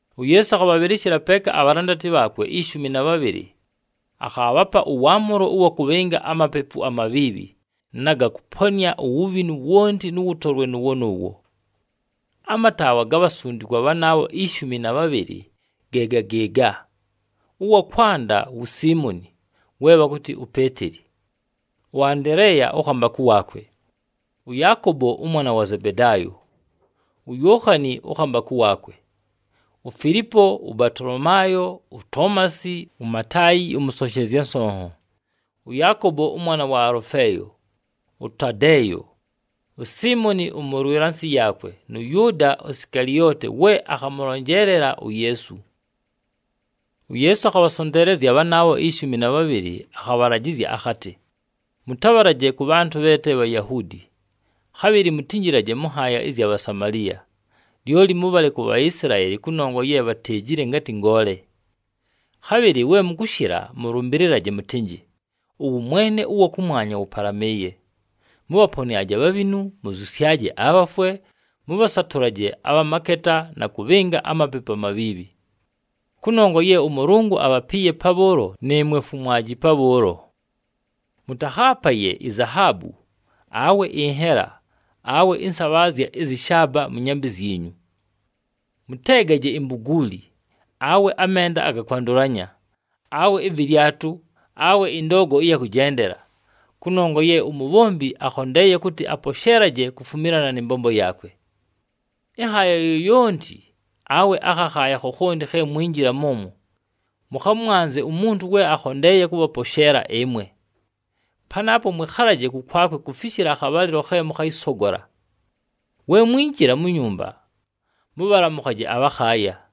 UYeesu akhabhabhɨlɨshɨla peeka abhalandati bhaakwe ishumi na bhabhɨlɨ. Akhaabhapa ʉwaamʉlo ʉwa kʉbhɨnga amapepu amabhiibhi na ga kʉponɨa uwubhinu wonti nʉ wʉtolwe nʉʉwo nʉʉwo. Amataawa ga bhasundikwa bhanaabho ishumi na bhabhɨlɨ ge ga gɨɨga, ʉwa kwanda wu Siimoni, we bhakʉtɨ uPeeteli, ʉAndeleeya ʉkhambakʉ waakwe, ʉYaakobo ʉmwana wa Zebedaayo, uYookhani ʉkhambakʉ waakwe, uFilipo, ʉBatolomaayo, uToomasi, uMataayi ʉmʉsonshezya nsonho, ʉYaakobo ʉmwana wa Alʉfeeyo, ʉTadeeyo, uSiimoni ʉmʉlwɨla nsɨ yaakwe nʉ Yʉʉda Sikalioti we akhamʉlonjeelela uYeesu. UYeesu akhabhasonteelezya bhanaabho ishumi na bhabhɨlɨ, akhabhalajɨzya akhatɨ, “Mʉtabhalaje kʉ bhantʉ bhe te Bhayahuudi, khabhɨlɨ mutinjilaje mʉ nhaaya ɨzya Bhasamaliya. Lyoli mʉbhale ku Bhaisilaeli kʉnongwa ye bhateejile ngatɨ ngoole. Khabhɨlɨ we mʉkʉshɨla, mʉlʉmbɨlɨlaje mʉtɨnjɨ, ‘Ʉwʉmwene ʉwa kʉmwanya wʉpalamɨɨye.’ Mʉbhaponɨaje abhabhinu, mʉzyʉsyaje abhafwe, mʉbhasatʉlaje abha maketa na kʉbhɨnga amapepu amabhiibhi. Kʉnongwa ye ʉMʉlʉngʉ abhapiiye pabhʉʉlo, nɨɨmwe fumwaji pabhʉʉlo. Mʉtakhaapaye izahaabu, awe ɨnhela, awe ɨnsabhaazya ɨzyɨ shaaba mʉ nyambɨ zyinyu. Mʉteegaje imbuguuli, awe amenda aga kwandʉlanya, awe ɨvɨlyatʉ, awe ɨndoogo ɨya kʉjendela. Kʉnongwa ye umubhombi akhondeeye kʉtɨ aposheelaje kufumilana nɨ mbombo yaakwe. Ɨnhaaya yoyonti awe akhakhaaya khokhonti khe mwinjila mʉmwo, mʉkhamwanze umuntu we akhondeeye kʉbhaposheela ɨmwe. Panaapo mwɨkhalaje kʉkwakwe kufishila akhabhalɨlo khe mʉkhayɨsogola. We mwinjila mu nyumba, mʉbhalamʉkhaje abhakhaaya.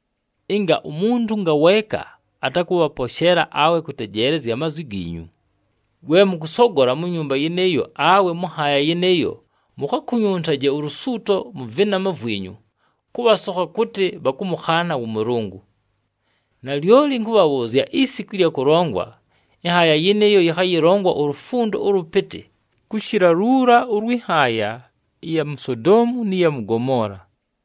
Ɨnga umuntu ngaweeka atakʉbhaposheela awe kʉtejeelezya amazwi giinyu, we mʉkʉsogola mu nyumba yɨnɨɨyo awe mʉ nhaaya yɨnɨɨyo mukhakunyuntaje ulusuuto mʉ vɨnama vwinyu, kʉbhasokha kʉtɨ bhakʉmʉkhaana wʉ Mʉlʉngʉ. Nalyoli ɨnkʉbhabhʉʉzya isiku ɨlya kʉlongwa, ɨnhaaya yɨnɨɨyo yɨkhayɨlongwa ulufundo ʉlʉpɨtɨ kʉshɨla luula ʉlwɨ nhaaya ɨya mu Sodoomu nɨ ya mʉ Gomoola!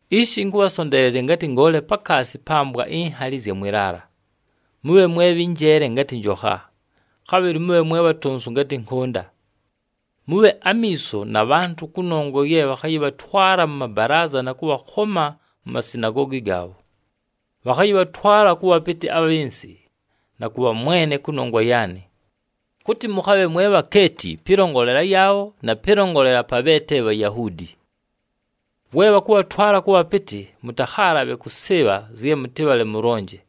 “Ishi, ɨnkʉbhasonteelezya ngatɨ ngoole pakaasi pa mbwa inhali ɨzya mwɨ laala. Mʉbhe mwe bhɨ njeele ngatɨ njokha, khabhɨlɨ mʉbhe mwe bhatonsu ngatɨ nkʉnda. Mʉbhe amiiso na bhantʉ, kʉnongwa ye bhakhayɨbhatwala mʉ mabalaaza na kʉbhakhoma mu masinagoogi gaabho. Bhakhayɨbhatwala kʉ bhapɨtɨ abhɨ nsɨ na kʉ bhamwene kʉnongwa yaanɨ, kʉtɨ mʉkhabhe mwe bhakeeti pɨlongolela yaabho na pɨlongolela pa bhe te Bhayahuudi. We bhakʉbhatwala kʉ bhapɨtɨ, mʉtakhaalabhe kʉsɨɨbha zye mʉtɨbhale mʉlonje.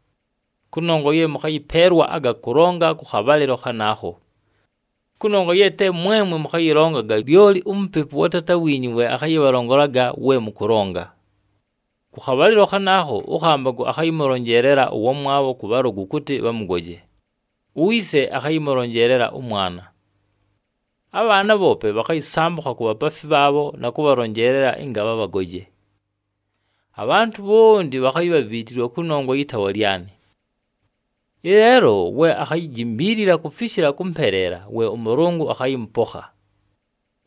Kʉnongwa ye mʉkhayɨpeelwa aga kʉlonga kʉ khabhalɨlo khanaakho. Kʉnongwa ye te mwemwe mʉkhayɨlongaga, lyoli uMupepu wa Taata wiinyu we akhayɨbhalongolaga we mʉkʉlonga. Kʉ khabhalɨlo khanaakho, ʉkhambakʉ akhayɨmʉlonjeelela ʉwamwabho kʉ bhalʉgʉ kʉtɨ bhamʉgoje, uyise akhayɨmʉlonjeelela ʉmwana. Abhaana bhoope bhakhayɨsambʉkha ku bhapaafi bhaabho na kʉbhalonjeelela ɨnga bhabhagoje. Abhantʉ bhonti bhakhayibhaviitilwa kʉnongwa yɨ taawa lyanɨ. Ɨleelo, we akhayijimbiilila kufishila kʉmpeleela we ʉMʉlʉngʉ akhayɨmʉpokha.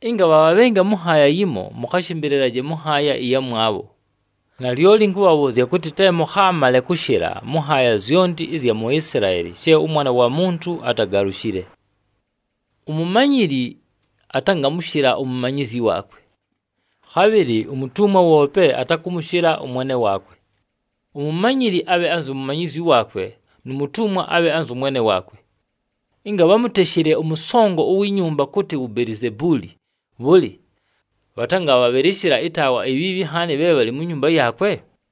Ɨnga bhabhabhɨnga mʉ nhaaya yimo, mʉkhashɨmbɨlɨlaje mʉ nhaaya ɨyamwabho. Nalyoli ɨnkʉbhabhʉʉzya kʉtɨ, te mʉkhaamale kʉshɨla mʉ nhaaya zyonti ɨzya mu Isilaeli she ʉMwana wa Muntu atagalushile. Umumanyili atangamʉshɨla umumanyizyi waakwe. Khabhɨlɨ umutumwa woope atakʉmʉshɨla ʉmwene waakwe. Umumanyili abhe anzu mumanyizyi waakwe nu mutumwa abhe anzʉ mwene waakwe. Ɨnga bhamuteshile ʉmʉsongo uwi nyumba kʉtɨ wu Belizebuuli, bhʉlɨ, bhatangabhabhɨlɨshɨla ɨtaawa ibhiibhi nhaani bhe bhalɨ mu nyumba yaakwe?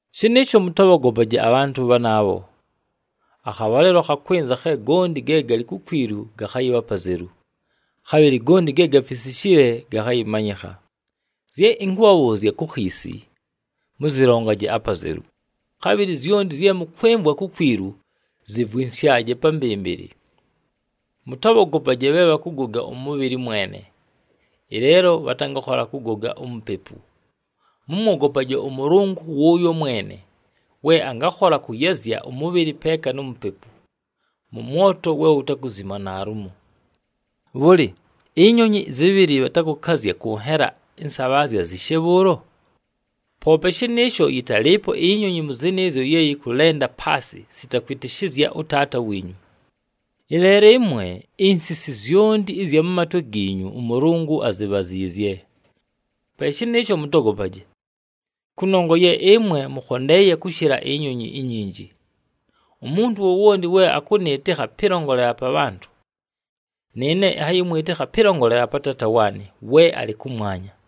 “Shɨnɨɨsho mʉtabhogopaje abhantʉ bhanaabho. Akhabhalɨlo khakwɨnza khe gonti ge galɨ kukwilu gakhayɨbha apazelu, khabhɨlɨ gonti ge gafisishile gakhayɨmanyɨkha. Zye ɨnkʉbhabhʉʉzya ku khiisi, mʉzɨlongaje apazelu. Khabhɨlɨ zyonti zye mʉkwɨmvwa kukwilu, zɨvwɨnsyaje pa mbɨmbɨlɨ. Mʉtabhogopaje bhe bhakʉgoga ʉmʉbhɨlɨ mwene, ɨleelo bhatangakhola kʉgoga umupepu. Mʉmwogopaje ʉMʉlʉngʉ wʉʉyo mwene we angakhola kʉyazya ʉmʉbhɨlɨ peeka nu mupepu mʉ mwoto we wutakuzima naalumo. Bhʉlɨ, ʉtʉdwaya tʉbhɨlɨ bhatakʉkazya kʉ nhela ɨnsabhaazya nyishe bhʉʉlo? Poope shɨnɨɨsho atalɨɨpo ʉdwaya mʉ bhanaabho we akʉlenda paasɨ sita kwɨtɨshɨzya ʉTaata wiinyu. Ɨleelo ɨmwe, insisi zyonti ɨzya mʉ matwe giinyu ʉMʉlʉngʉ azibhaziizye. Pe shɨnɨɨsho mʉtogopaje, kʉnongwa ye ɨmwe mʉkhondeeye kʉshɨla ʉtʉdwaya utwinji. Umuntu wowonti we akʉnɨɨtɨkha pɨlongolela pa bhantʉ, nɨɨne ɨnhayɨmwɨtɨkha pɨlongolela pa Taata waanɨ we alɨ kʉmwanya.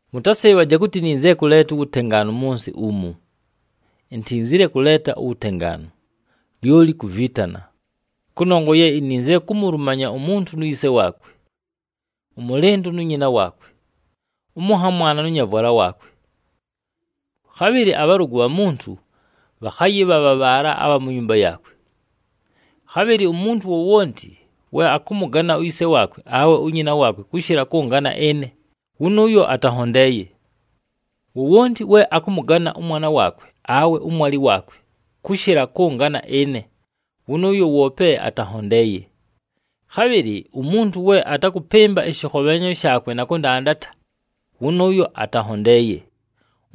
“Mʉtasɨɨbhaje kʉtɨ ininzile kʉleeta uwutengaanu mʉ nsɨ umu. Intinzile kʉleeta uwutengaanu, lyoli kuviitana. Kʉnongwa ye ininzile kumulumanya umuntu nu yise waakwe, ʉmʉlɨndʉ nu nyina waakwe, ʉmʉnhamwana nʉ nyavwala waakwe. Khabhɨlɨ abhalʉgʉ bha muntu bhakhayɨbha bha bhaala abha mu nyumba yaakwe. Khabhɨlɨ umuntu wowonti we akʉmʉgana uyise waakwe awe unyina waakwe kʉshɨla kʉngana ɨne, wʉnʉʉyo atanhondeeye. Wowonti we akʉmʉgana ʉmwana waakwe awe ʉmwalɨ waakwe kʉshɨla kʉngana ɨne, wʉnʉʉyo woope atanhondeeye. Khabhɨlɨ umuntu we atakʉpɨmba ɨshɨkhobhenhanyo shaakwe na kʉndandata, wʉnʉʉyo atanhondeeye.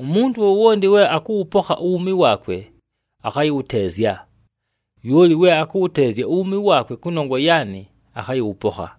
Umuntu wowonti we akʉwʉpokha uwuumi waakwe, akhayɨwʉteezya. Lyoli we akʉwʉteezya uwuumi waakwe kʉnongwa yaanɨ, akhayɨwʉpokha.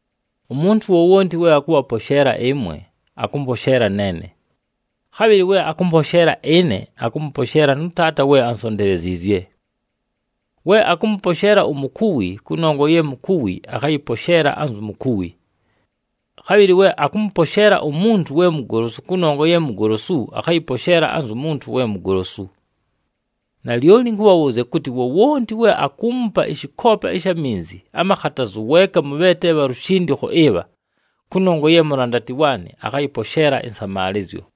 “Umuntu wowonti we akʉbhaposheela ɨmwe, akʉmposheela neene. Khabhɨlɨ we akʉmposheela ɨne, akʉmʉposheela nʉ Taata we ansonteleziizye. We akʉmʉposheela umukuwi kʉnongwa ye mukuwi, akhayɨposheela anzu mukuwi. Khabhɨlɨ we akʉmʉposheela umuntu we mugolosu kʉnongwa ye mugolosu, akhayɨposheela anzu muntu we mugolosu. Nalyoli ɨnkʉbhabhʉʉzya kʉtɨ, wowonti we akuumupa ɨshɨkoopa ɨsha minzi amakhatazu weeka mʉ bhe te bha lushindikho ɨbha kʉnongwa ye mulandati waanɨ, akhayɨposheela ɨnsamaalɨzyo.”